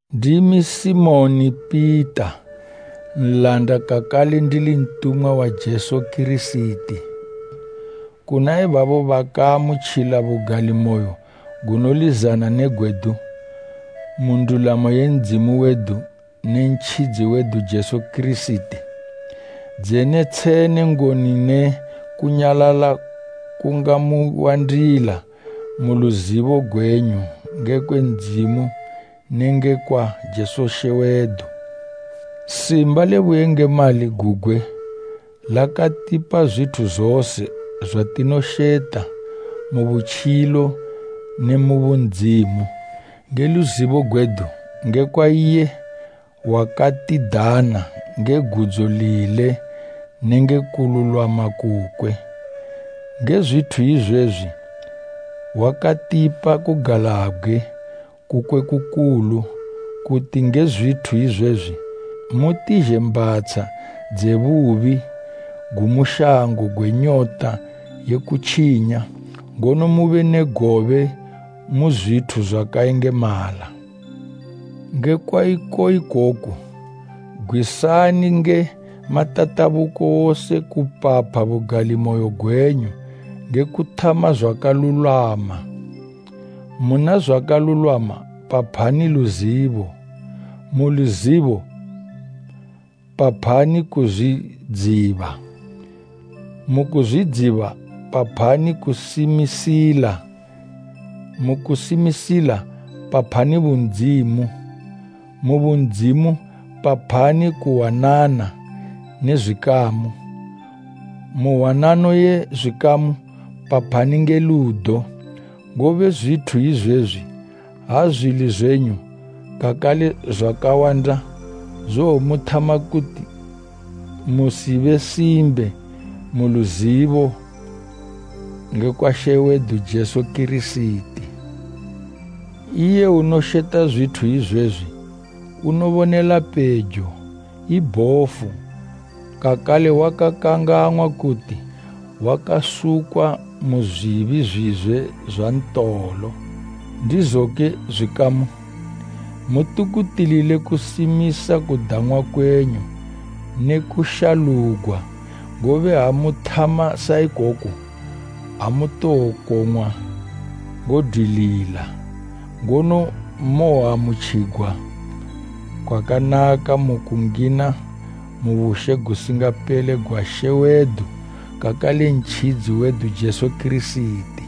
Ndimi Simoni Pita, nlanda kakale ndili ntumwa wa Jesu Kirisiti. Kuna ibabo bakaamutjila bugalimoyo gunolizana ne gwedu, mu ndulamo ye Ndzimu wedu ne Ntjidzi wedu Jesu Kirisiti: Dzene tshene ngoni ne kunyalala kungamuwandila mu luzibo gwenyu ngekwe Ndzimu ne ngekwa Jesu She wedu. Simba le buyengemali gugwe lakatipa zwithu zose zwatinosheta mu butjilo ne bundzimu, nge luzibo gwedu ngekwa iye wakatidana nge gudzo lile nenge kululwama kukwe. Nge zwithu izwezwi wakatipa kugalabgwe kukwe kukulu, kuti nge zwithu izwezwi, mutizhe mbhatsha dze bubi gumu shango gwe nyota ye kutjinya, ngono mube ne gobe mu zwithu zwakayengemala. Ngekwa iko ikoku, gwisani nge matatabuko wose kupapha bugalimoyo gwenyu nge kuthama zwakalulwama, muna zwakalulwama paphani luzibo. Mu luzibo paphani kuzwidziba, mukuzwidziba paphani kusimisila, mukusimisila paphani bundzimu, mu bundzimu paphani kuhwanana ne zwikamu, mu hwanano ye zwikamu paphani nge ludo. Ngobe zwithu izwezwi ha zwili zwenyu kakale zwakawanda, zowomuthama kuti musibe simbe mu luzibo ngekwa She wedu Jesu Kirisiti. Iye unosheta zwithu izwezwi unobonela pejo, i bhofu, kakale wakakangang'wa kuti wakasukwa mu zwibi zwizwe zwa ntolo. Ndizoke zwikamu, mutukutilile kusimisa kudang'wa kwenyu ne kushalugwa, ngobe ha muthama sa ikoku, amutowokong'wa ngodwilila. Ngono mowoamutjigwa kwakanaka mu kungina mu bushe gusingapele gwa She wedu, kakale Ntjidzi wedu Jesu Kirisiti.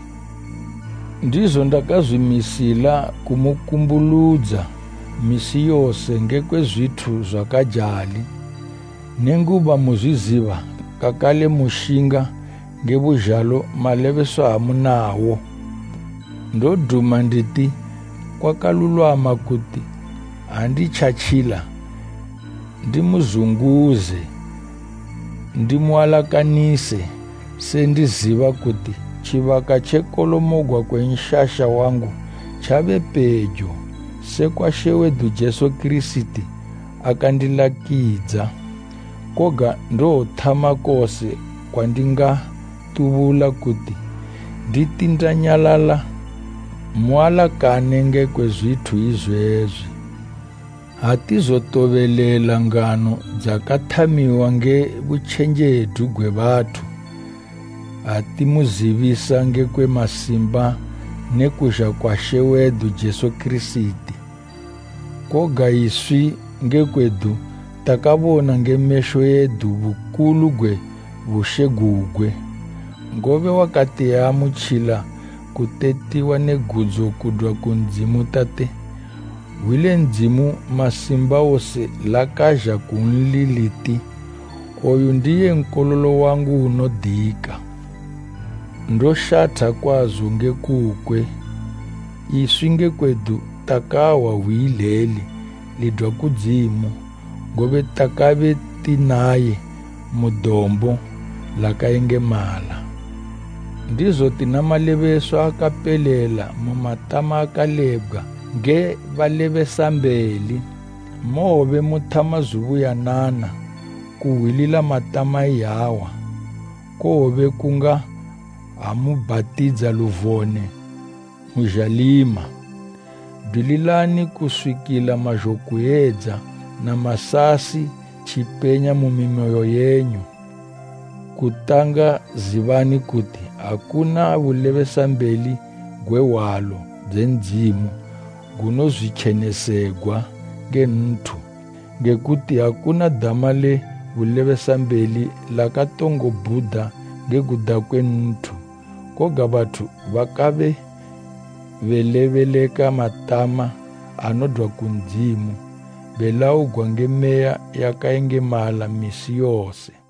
Ndizo ndakazwimisila kumukumbuludza misi yose ngekwe zwithu zwakajali, nenguba muzwiziba kakale mushinga nge buzhalo malebeswa amunawo. Ndoduma nditi kwakalulwama kuti ha nditjatjila ndimuzunguze, ndimualakanise, se ndiziba kuti tjibaka tje kolomogwa kwe nshasha wangu tjabe pejo, sekwa She wedu Jesu Kirisiti akandilakidza. Koga ndowothama kose kwandingatubula kuti nditi ndanyalala, mualakane ngekwe zwithu izwezwi. Atizotobelela ngano dzakathamiwa nge butjenjedu gwe bathu, ha timuzibisa ngekwe masimba ne kuzha kwa She wedu Jesu Kirisiti, koga iswi nge kwedu takabona nge mesho edu bukulu gwe bushe gugwe. Ngobe wakati eamutjila kutetiwa ne gudzo kudwa ku Ndzimu Tate. Hwi le Ndzimu Masimbawose lakazha kunli liti, “Oyu ndiye Nkololo wangu unodika, ndoshatha kwazo nge kukwe!” Iswi nge kwedu takahwa hwi ileli lidwa kudzimu, ngobe takabe ti naye mu dombo lakayengemala. Ndizo tina malebeswa akapelela mu matama akalebgwa nge balebesambeli. Mowobe muthama zubuyanana kuhwilila matama iyawa, kowobe kunga ha mubhatidza luvone mu zhalima. Dwililani kuswikila mazhokuyedza na masasi tjipenya mu mimoyo yenyu. Kutanga zibani kuti akuna bulebesambeli gwe hwalo dze Ndzimu gunozwitjenesegwa nge nthu, nge kuti akuna dama le bulebesambeli lakatongo bhuda nge kuda kwe nthu, koga bathu bakabe belebeleka matama anodwa ku Ndzimu, belaugwa nge Meya yakayengemala misi yose.